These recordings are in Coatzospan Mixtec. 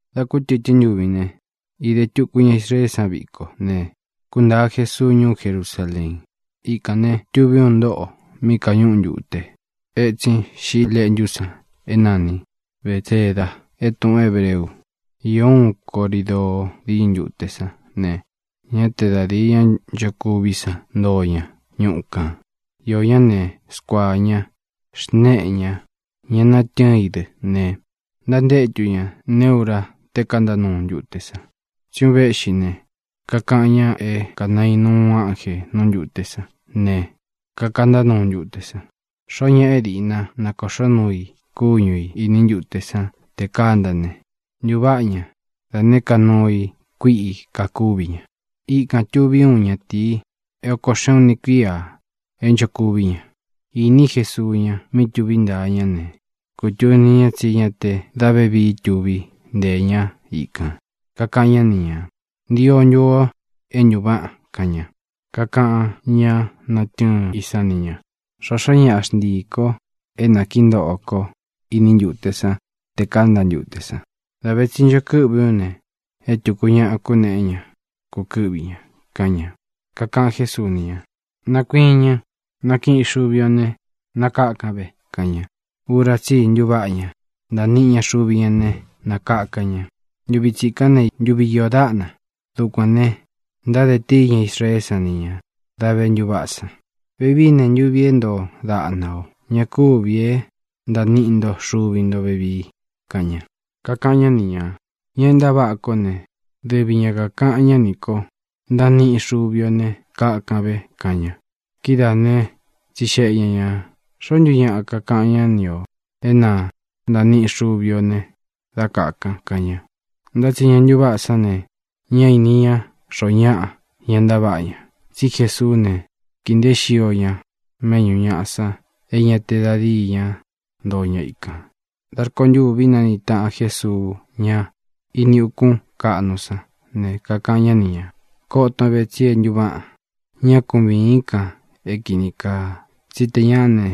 Dā kútɨtɨ́n ntuvi ne, īde tuku ña Israeé san viko ne, kúntāa Jesuu ñuú Jerusaleen. Ikān ne, tuví uun ntóꞌo mí kāñúꞌu ntute etsin Xiꞌi Leꞌntú san é nani Bētseda é tūꞌun hébreu. Īó uꞌun corídoo díñɨ ntute sán ne, ñá te da dīi ñá nchokuví san ntoo ña ñuꞌu kān. Iō ñá ne, skuaā ña, xnéꞌē ña, ñá natɨ́ɨn i dɨ́ ne, ntantétu ña neé ura tē kanta nuu ntute san. Tsí un véꞌxi ne, kakaꞌan ñá é kanainu uun ánjē nú ntūte san ne, kakanta nuu ntūte san. Xoó ñaꞌa é diꞌna nakōꞌxó nuu i kúñu ī iní ntute sán tē kánta ne, ntūváꞌa ña da nēé ka nuu kuíꞌi kakúvi ña. Ikān tuví uun ñatīi é ōko xeꞌun uni kuíā é nchokuví ña. Iní Jesuu ña mí tuví ntaa ñá ne, kutūni ña tsí ña te dá vevii tuví nteē ñá ikān. Kakaꞌan ñá ni ñā: —¿Ntio ntu o é ntuváꞌan? —kaꞌan ña. Kakaꞌan ñá natɨ́ɨn i san ni ña: —Xōxó ñaꞌa xntii ī ko é nakīí ntoꞌo kó iní ntute san te kánta ntute san. Dā ve tsi ncho kɨ́ꞌvi ú ne, é tūku ñaꞌa kúnēꞌé ña kūkɨ́ꞌvi ña —kaꞌan ña. Kakaꞌan Jésuu ni ña: —Nakuiñɨn. Nakíꞌin xuvi o ne, nakakan ve —kaꞌan ña. Ura tsí i ntuváꞌa ña. Ntaa niꞌi ña xuvi ña ne, nakaka ña. Ntuvi tsikán ne, ntuvi iō dáꞌna. Dukuān ne, ntáde tíi ña Israeé san ni ña dā vé ntuváꞌa san: —Vevií ne, ntuvi é ntoo daꞌna ō. Ña kuvi é ntaa niꞌi nto xuvi ntō vevii —kaꞌan ña. Kakaꞌan ñá ni ñā: —Ña é ntaváꞌa kó ne, dɨvi ña kākaꞌan ñá nī ko: “Ntaan niꞌin xuvi o ne, nakakan ve” —kaꞌan ña. Kidáa ne, tsixeꞌe ña ñā: —¿Xoó ntu ñaꞌa kakaꞌan ñá ni ō é na ntaan niꞌin xuvi ō ne, dá nakakan? —kaꞌan ña. Ntá tsi ña ntuváꞌa sán ne, ñá īni ña xoo ñáꞌa ña ntaváꞌa ña. Tsi Jesuú ne, kīi nteé xio ña méꞌñū ñaꞌa san é ña te da díi ña ntoo ña ikān. Dā rkontûvi nániꞌi tāꞌan Jesuu ña ini ukún kaꞌnu sán ne, kakaꞌan ñá ni ñā: —Koton ve, tsi é ntuváꞌan. Ñá ku vīín kan é kīni kaa, tsí tē ñáꞌa ne,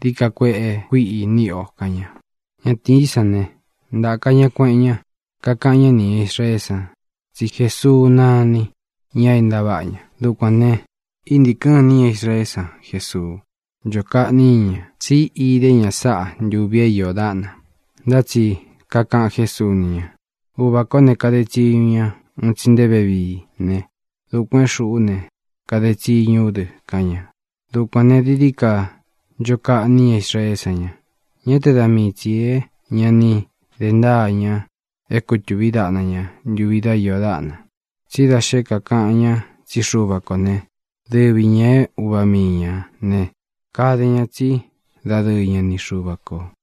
dií ka kueꞌe kuiꞌi níꞌi o —kaꞌan ña. Ñatīí san ne, ntāka ña, kueꞌen ña, kakaꞌan ñá ni ñā Israeé san tsí Jesuu náni ña é ntaváꞌa ña. Dukuān ne, íntīkɨn nuu iní ña Israeé san Jesuu. Ncho kaꞌní ña ña, tsí idé ña sáꞌa ntuvi é iō dáꞌna. Ntá tsi kakaꞌan Jésuu ni ña: —Uvā kó ne, kade tsiñu ña un tsi nte vevií ne, dukuān é xūꞌú ne, kade tsiñu ú dɨ —kaꞌan ña. Dukuān ne, dií dií ka ncho kaꞌní ña Israeé san ña. Ñá te da mii tsī é ña ni de ntáa ña é kūtuví daꞌna ña ntuvi dá iō dáꞌna, tsí da xé kakaꞌan ña tsí Xuva kō né, dɨvi ñā é uva mii ñā ne, kade ña tsí dadɨɨ ña ni Xuva kō.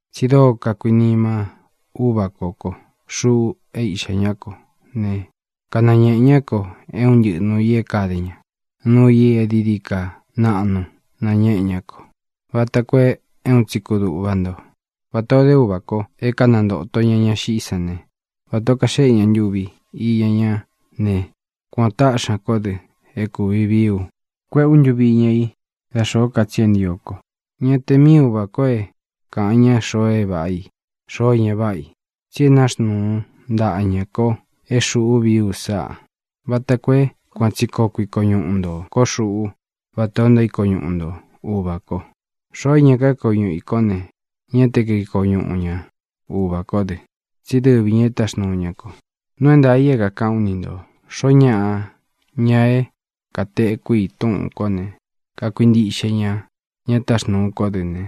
Tsi dóo kakuinima Úvā kó ko, xuꞌu é Iꞌxā ñá ko ne, kanañēꞌe ñá ko é un ntɨꞌɨ nuū i é kāde ña. Nuu i é dií dií ka naꞌnu nañēꞌe ñá ko vata koo é un tsi kudūꞌva nto. Vatā ó de Uvā kó é kanantōto ña ña xiꞌí san ne, vata ō kaxeꞌé ña ntuvi iña ñá ne, kuān o táꞌxi ña kó dɨ é kūvi vií u kuéꞌē ú ntuvi iña i dá xōó ka tsi é ntio ko. Ñá te mii Uvā kó é kāꞌan ñá xoo é váꞌa i, xoo é ña váꞌa i, tsi é naxnuu ntaꞌa ñā ko é xūꞌu vií u sáꞌa, vata koo é kuan tsi koo kuiko ñuꞌu ntō kó xuꞌú vatā o ntaíko ñuꞌu nto Uvā ko. Xoo é ña kaíko ñuꞌu ī kó ne, ñá te kaiko ñuꞌu ña Uvā kó dɨ, tsí dɨvi ñā é táxnūu ña ko. ʼNuu é ntaā i é kākaꞌán u ni ntō: Xoó ñaꞌa, ña é katekú i túꞌūn kó ne kakuintiꞌxe ña ña táxnūu kó dɨ ne,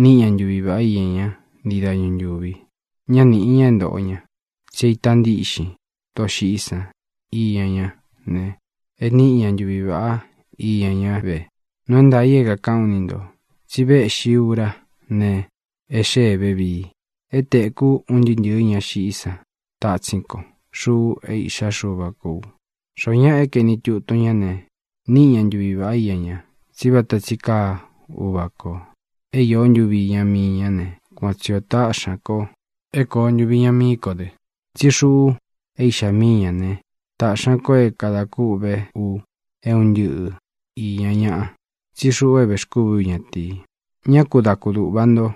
níꞌi ña ntuvi vāꞌá iña ña ntii dañu ntúvi. Ñá nīꞌi ña é ntōꞌo ña. Tsí é itā ntíꞌxin doxiꞌí san iña ñá ne, e níꞌi ña ntuvi vāꞌá iña ñá ve. Nuu é ntaā i é kākaꞌán u ni ntō tsi véꞌxi ūra ne, e xéē vevii, é tēkú un ntɨɨ́ ntɨ̄ɨ ña xiꞌí san tatsín ko, xuꞌu é Iꞌxá Xuva kō u. Xoó ñaꞌa é kaeni tutun ñá ne, níꞌi ña ntuvi vāꞌá iña ña. Tsí vata tsi kaa Uvā ko, é īó ntuvi iña mii ñá ne, kuan tsi ō táꞌxi ña ko é kōo ntuvi iña mií ko dɨ, tsí xuꞌu é Iꞌxá mii ñā né, tāꞌxi ña ko é kadā kûꞌvé u é un ntɨꞌɨ īña ñaꞌa, tsí xuꞌu é vēxkúvī ú ñatīi. Ñá ku da kudūꞌva nto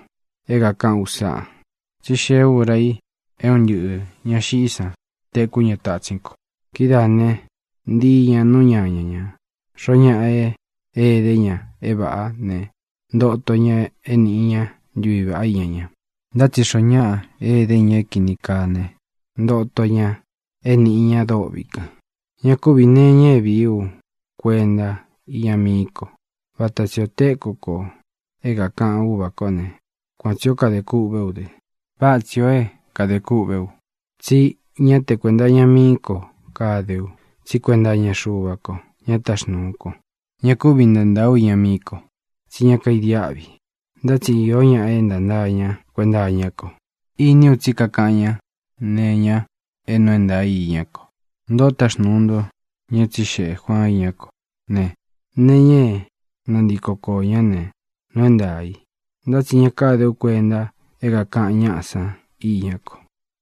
é kākaꞌán u sáꞌa, tsí xee úra i é un ntɨꞌɨ̄ ña xiꞌí san tekú ña tatsín ko. Kidáa ne, ntii ñā nú ñaña ñā. Xoó ñaꞌa é ēdé ña é vāꞌá ne, ntoto ña é nīꞌi ña ntuví vaꞌá iña ña. Ntá tsi xoo ñáꞌa é ēdé ña é kīni kaa ne, ntoto ña é nīꞌi ña dôꞌvi kan. ʼÑa kúvī nee iña é vii ú kuenta iña mií ko. Vata tsī o tékū ko é kākaꞌan Úvā kó ne, kuan tsī ó kade kûꞌvé u dɨ́ ne, váꞌa tsī ó e kade kûꞌvé u, tsi ñá te kuēnta iña mií ko kade u, tsí kuenta iña Xuva ko, ña táxnūu ko. Ña kúvi ntantaa u iña mií ko, tsí ña kaidiáꞌvi. Ntá tsi iō ña é ntantaa ña kuenta iñá ko. Iní u tsí kakaꞌan ñá nee iña é nuu é ntaā i iñá ko. Ntoꞌó taxnūu nto ña é tsixeꞌē Juaan iñá ko ne, nee iña é nantíko koō ñá ne, nuu é ntaā i. Ntá tsi ña káde ú kuenta é kākaꞌan ñáꞌa san iñá ko.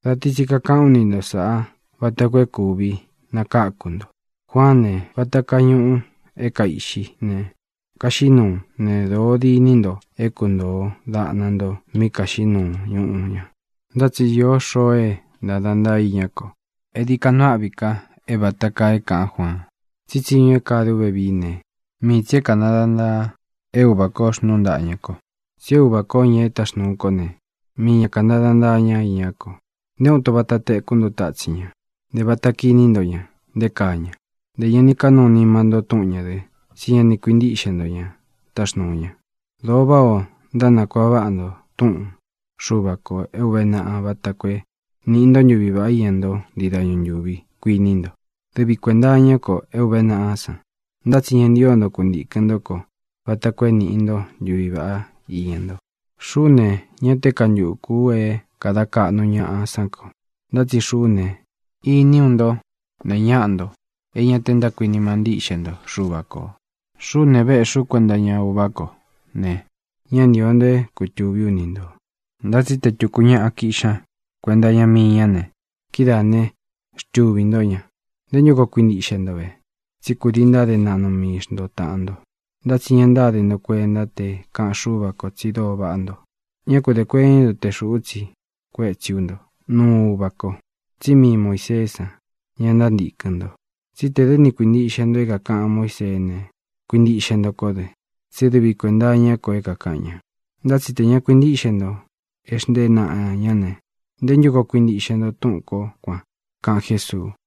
Da ti tsi kakaꞌán u ni nto sāꞌá vata koo é kūvi nakáku nto. Juaán ne, vata kaa ñuꞌu é kaiꞌxí ne, kaxiꞌí nuu ne, dōo diní nto é kuntōo daꞌna nto mí kāxiꞌí nuu ñuꞌu ña. Ntá tsi īó xoo é ntāda ntaa í iñá ko é dií ka nuu áꞌvi ka é vāta kaa é kāꞌán Juaan. Tsí tsiñu é kade ú vevií ne, mii tsī é kāntada ntaa é Uvā kó xnúu ntāꞌa ña ko. Tsí Uvā kó, ña e táxnūu kó ne, mii ña kāntada ntaa ñá iñá ko. Nté uun ito vata téku nto tátsin ña. Ntē vata kiní nto ña nté kaa ña. Ntē ña ni kánūu nima ntó túꞌun ñā dɨ. Tsí ña ni kuīntíꞌxe nto ña táxnuu ña. Dōo váꞌā ó ntánakuaꞌa váꞌa nto túꞌun Xuva kō é ūve naꞌa vata koo é nīꞌi ntó ntuví vaꞌá iña ntó ntii dañu ntūvi, kuiní nto. Dɨvī kuenta iñá ko é ūve naꞌa san. Ntá tsi ñá ntio nto kuntīkɨn ntó ko vata koo é nīꞌi ntó ntuví vaꞌá iña nto. ʼXuꞌú ne, ñá te kantukū u é kada kaꞌnu ñaꞌa sán ko. Ntá tsi xuꞌú ne, iní u nto ne ñáꞌa nto é ña te ntákuinima ntíꞌxe nto Xuva kō. Xuꞌú ne, véꞌxī ú kuenta iña Uvá ko ne, ña ntío nto é kutūví u ni ntō. Ntá tsi te tūku ñáꞌa kiꞌxi ña kuenta iña mii ñá ne, kidáā né, xtuvī ntó ña. ¿Nté ntu koo kuintiꞌxe nto ve? Tsí kūdii ntáde naꞌnu mii xnto tāꞌan nto, ntá tsi ña ntáde nto kuenta te kaꞌan Xúva kō tsi dóo vaꞌá nto. Ñá ku dē kuení nto te xūꞌú tsiꞌi kuétsi ú nto nuu Uvá ko, tsí mii Muīseé san, ña ntántīkɨn nto. Tsí tē dɨ́ ni kuīntiꞌxe nto é kākaꞌan Muíseé ne, kuintiꞌxe nto kó dɨ, tsí dɨvi kuēnta iñá ko é kāꞌan ña. Ntá tsi tē ña kuintíꞌxe nto e xntée naꞌa ñā ne, ¿nté ntu koo kuintiꞌxe nto túꞌūn kó kuan? —kaꞌan Jésuu.